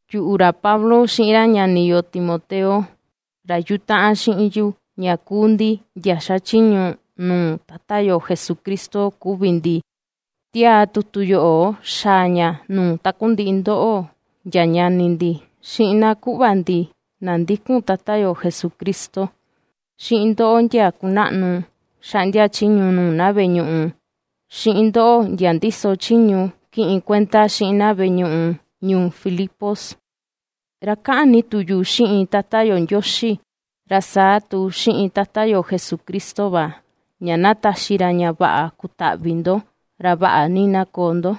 Yuꞌu, ra Pablo, xiꞌin ra ñani yo Timoteo, ra yutaꞌan xiꞌin yu ña kuu ndi ndia xachiñu nuu Tata yo Jesucristo kuvi ndi ^tiaa tutu yoꞌo xaa ña nuu takundiꞌi ndoꞌo ndia ñani ndi, xiꞌin na kuꞌva ndi na ndikun Tata yo Jesucristo, xiꞌin ndoꞌo, ndia kunaꞌnu xaꞌndia chiñu nuu na veꞌe ñuꞌu, xiꞌin ndoꞌo, ndia ndíso chiñu kiꞌin kuenda xiꞌin na veꞌe ñuꞌu ñuu Filipos. Ra kaꞌan ni tu yu xiꞌin Tata yo Ndioxi, ra saa tu xiꞌin Tata yo Jesucristo va, ña na taxi ra ña vaꞌa kutaꞌvi ndo, ra vaꞌa ni na koo ndo.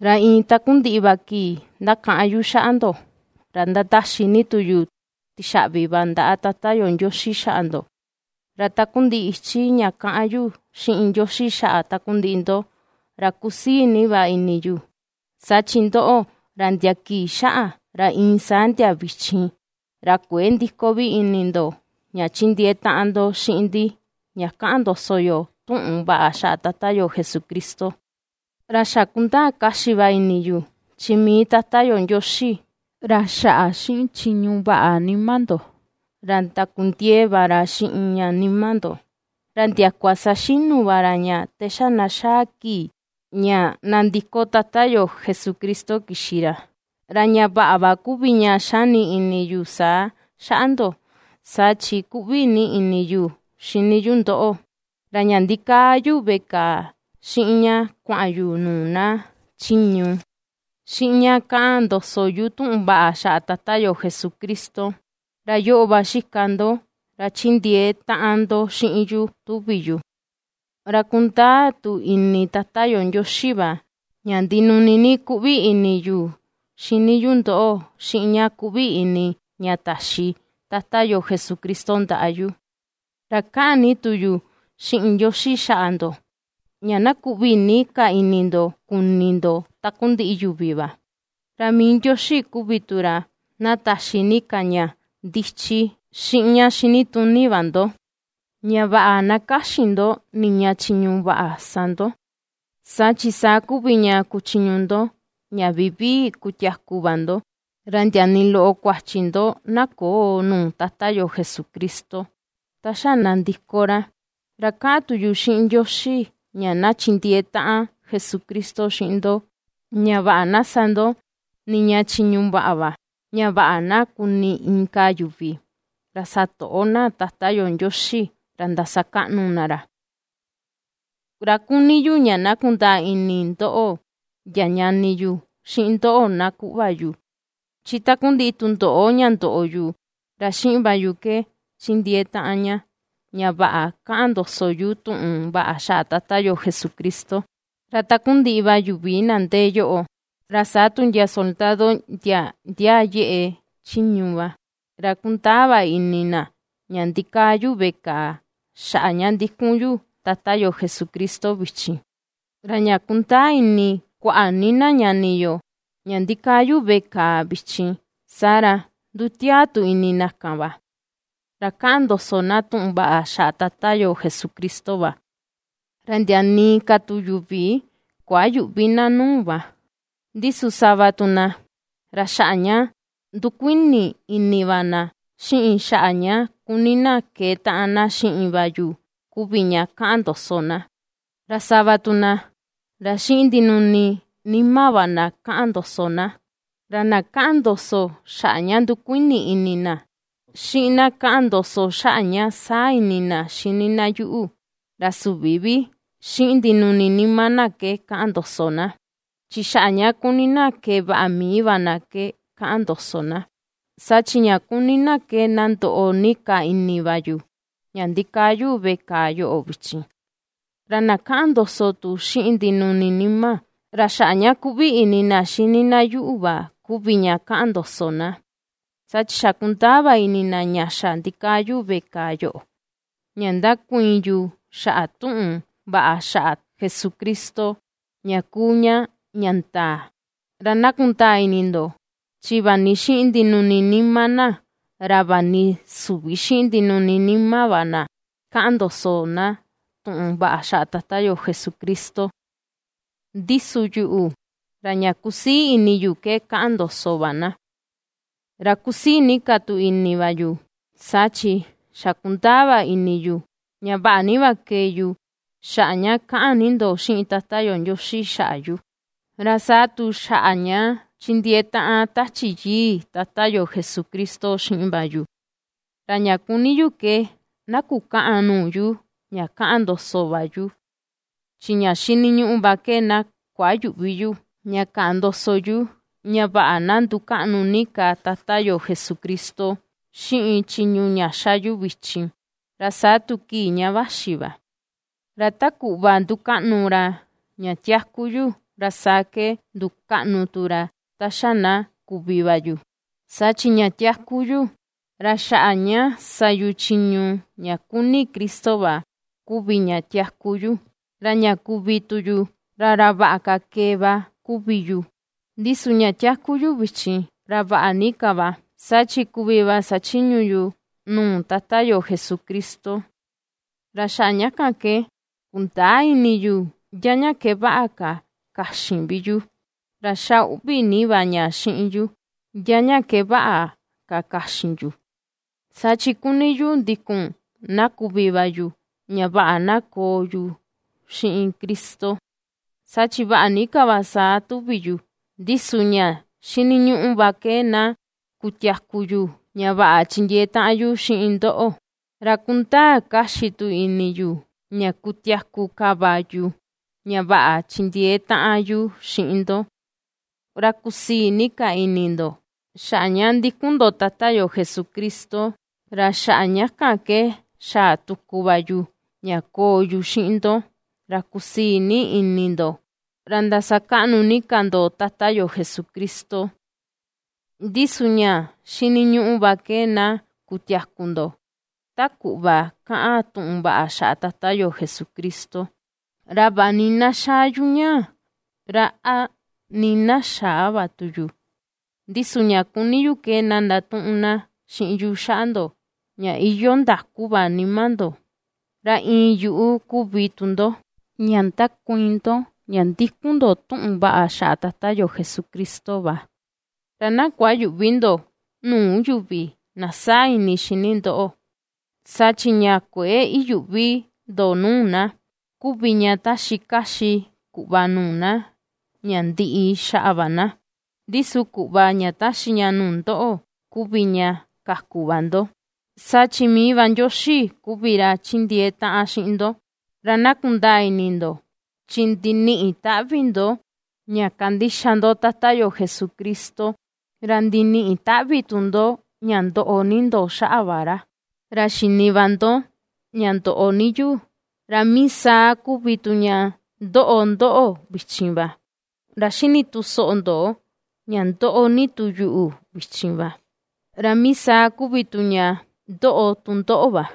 Ra iin takundiꞌi va kii ndakaꞌan yu xaꞌa ndo, ra ^ndataxi ni tu yu tixaꞌvi va ndaꞌa Tata yo Ndioxi xaꞌa ndo. Ra takundiꞌi ichi ña kaꞌan yu xiꞌin Ndioxi xaꞌa takundiꞌi ndo, ra kusii ni va ini yu, saa chi ndoꞌo, ra ndia kii xaꞌa ra iin saa ndia vichin, ra kuëe ndiko vi ini ndo, ña chindiee taꞌan ndo xiꞌin ndi ña ^kaꞌan ndoso yo tuꞌun vaꞌa xaꞌa Tata yo Jesucristo. Ra xa kundaa kaxi va ini yu, chi mii Tata yo Ndioxi, ra xaꞌa xiꞌin chiñu vaꞌa nima ndo, ra ndakundiee va ra xiꞌin ña nima ndo, ra ndiakua saxinu va ra ña te xa na xaa kii ña nandiko Tata yo Jesucristo kixi ra. Ra ña vaꞌa va kuvi ña xani ini yu saa xaꞌa ndo, saa chi kuꞌvi ni ini yu xini yu ndoꞌo, ra ña ndikaa yu veꞌe kàà, xiꞌin ña kuaꞌan yu nuu na chiñu, xiꞌin ña kaꞌan ndoso yu tuꞌun vaꞌa xaꞌa Tata yo Jesucristo, ra yoꞌo va xika ndo ra chindiee taꞌan ndo xiꞌin yu tuvi yu. Ra kundaa tu ini Tata yo Ndioxi va, ña ndinuni ni kuꞌvi ini yu xini yu ndoꞌo, xiꞌin ña kuꞌvi ini ña taxi Tata yo Jesucristo ndaꞌa yu. Ra kaꞌan ni tu yu xiꞌin Ndioxi xaꞌa ndo, ña na kuꞌvi ni ka ini ndo kuni ndo takundiꞌi yuvi va, ra mii Ndioxi kuvi tu ra na taxi ni ka ña ndichi xiꞌin ña xinituni va ndo, ña vaꞌa na kaxin ndo niña chiñu vaꞌa sa ndo. Saa chi, saa kuvi ña kuchuun ndo, ña vivii kutiaku va ndo, ra ndia nii loꞌo kuachi ndo na köo nuu Tata yo Jesucristo, ta xa na nandiko ra. Ra kaꞌan tu yu xiꞌin Ndioxi ña na chindiee taꞌan Jesucristo xiꞌin ndo, ña vaꞌa na sa ndo niña chiñu vaꞌa va, ña vaꞌa na kuni inka yuvi, ra satoꞌo na Tata yo Ndioxi, ra ndasakaꞌnu na ra. Ra kuni yu ña na kundaa ini ndoꞌo, ndia ñani yu, xiꞌin ndoꞌo na kuꞌva yu, chi takundiꞌi tundoꞌo ña ndoꞌo yu, ra xiꞌin va yu ke ^chindiee taꞌan ña, ña vaꞌa ^kaꞌan ndoso yu tuꞌun vaꞌa xaꞌa Tata yo Jesucristo. Ra takundiꞌi va yuvi na ndee yoꞌo, ra saa tu ndia soldado ndia ndiaa yeꞌe chiñu va, ra kundaa va ini na, ña ndikaa yu veꞌe kàà xaꞌa ña ndikun yu Tata yo Jesucristo vichin. Ra ña ^kundaa ini kuaꞌa ni na ñani yo, ña ndíkáa yu veꞌe kàà vichin, saa ra, ndutiaa tu ini na kan va, ra ^kaꞌan ndoso na tuꞌun vaꞌa xaꞌa Tata yo Jesucristo va, ra ndia nii ka tu yuvi kuayüꞌvi na nuu va. Ndi su sava tu na, ra xaꞌa ña ndukuini ini va na, xiꞌin xaꞌa ña kuni na keetaꞌan na xiꞌin va yu kuvi ña kaꞌan ndoso na; ra sava tu na, ra xiꞌin ndinuni nima va na kaꞌan ndoso na. Ra na kaꞌan ndoso xaꞌa ña ndukuini ini na, xiꞌin na kaꞌan ndoso xaꞌa ña saa ini na xini na yuꞌu, ra süvi vi xiꞌin ndinuni nima na ke kaꞌan ndoso na, chi xaꞌa ña kuni na kee vaꞌa mii va na ke kaꞌan ndoso na, saa chi ña kuni na ke na ndoꞌo ni ka ini va yu, ña ndikaa yu veꞌe kàà yoꞌo vichin. Ra na kaꞌan ndoso tu xiꞌin ndinuni nima, ra xaꞌa ña kuꞌvi ini na xini na yuꞌu va kuvi ña kaꞌan ndoso na, saa chi xa kundaa va ini na ña xa ndikaa yu veꞌe kàà yoꞌo, ña ndakuiin yu xaꞌa tuꞌun vaꞌa xaꞌa Jesucristo, ña kuu ña ña ndaa. Ra na kundaa ini ndo, chi vaꞌa ni xiꞌin ndinuni nima na, ra vaꞌa ni süvi xiꞌin ndinuni nima va na kaꞌan ndoso na tuꞌun vaꞌa xaꞌa Tata yo Jesucristo, ndi su yuꞌu, ra ña ^kusii ini yu ke kaꞌan ndoso va na. Ra kusii ni ka tu ini va yu, saa chi xa kundaa va ini yu, ña vaꞌa ni va kee yu, xaꞌa ña ^kaꞌan ni ndo xiꞌin Tata yo Ndioxi xaꞌa yu, ra saa tu xaꞌa ña ^chindiee taꞌan Tachi Yii Tata yo Jesucristo xiꞌin va yu. Ra ña kuni ni yu ke na kukäꞌan nuu yu ña kaꞌan ndoso va yu, chi ña xiniñuꞌu va ke na kuayüꞌvi yu ña kaꞌan ndoso yu, ña vaꞌa na ndukaꞌnu ni ka Tata yo Jesucristo, xiꞌin chiñu ña ^xa yu vichin, ra saa tu kii ña vaxi va, ra ta kuꞌva ^ndukaꞌnu ra ña tiaku yu, ra saa ke ndukaꞌnu tu ra ta xa na kuvi va yu. Saa chi ña tiaku yu, ra xaꞌa ña sa yu chiñu ña kuni Cristo va kuvi ña tiaku yu, ra ña kuvi tu yu, ra ra vaꞌa ka kee va kuvi yu. Ndi su ña tiaku yu vichin, ra vaꞌa ni ka va, saa chi kuvi va sachiñu yu nuu Tata yo Jesucristo, ra xaꞌa ña kan ke, kundäa ini yu ndia ña ke vaꞌa ka kaxin vi yu. Ra ^xa uꞌvi ni va ña xiꞌin yu ndia ña ke vaꞌa ka kaxin yu; saa chi kuni yu ndikun na kuvi va yu ña vaꞌa na koo yu xiꞌin Cristo, saa chi vaꞌa ni ka va saa tuvi yu; ndi su ña xiniñuꞌu va ke na kutiaku yu ña vaꞌa chindiee taꞌan yu xiꞌin ndoꞌo. Ra ^kundaa kaxi tu ini yu, ña kutiaku ka va yu, ña vaꞌa chindiee taꞌan yu xiꞌin ndo, ra kusii ni ka ini ndo, xaꞌa ña ndikun ndo Tata yo Jesucristo. Ra xaꞌa ña kan ke xaa tuku va yu, ña koo yu xiꞌin ndo, ra kusii ni ini ndo, ra ndasakaꞌnu ni ka ndo Tata yo Jesucristo. Ndi su ña xiniñuꞌu va ke na kutiaku ndo ta kuꞌva kaꞌan tuꞌun vaꞌa xaꞌa Tata yo Jesucristo. Ra vaꞌa nii na xaa yu ñaa, ra a nii na xäa va tu yu, ndi su ña kuni yu ke na ndatuꞌun na xiꞌin yu xaꞌa ndo ña iyoo ndaku va nima ndo, ra iin yuꞌu kuvi tu ndo, ña ndakuiin ndo ña ndikun ndo tuꞌun vaꞌa xaꞌa Tata yo Jesucristo va, ra na kuayüꞌvi ndo nuu yuvi na saa ini xini ndoꞌo. Saa chi ña kuëe iyuꞌvi ndo nuu na, kuvi ña taxi kaxi kuꞌva nuu na ña ndiꞌi xaꞌa va na, ndi su kuꞌva ña taxi ña nuu ndoꞌo kuvi ña kaku va ndo, saa chi mii va Ndioxi kuvi ra chindiee taꞌan xiꞌin ndo. Ra na kundaa ini ndo, chi ndiniꞌi taꞌvi ndo ña kandixa ndo Tata yo Jesucristo, ra ndiniꞌi taꞌvi tu ndo ña ndoꞌo ni ndo xaꞌa va ra. Ra xini va ndo ña ndoꞌo ni yu, ra mii saa kuvi tu ña ^ndoꞌo ndóꞌo̱ vichin va. Ra ^xini tu soꞌo ndo ña ^ndoꞌo ni tu yu vichin va, ra mii saa kuvi tu ña ^ndoꞌo tu ndóꞌo̱ va.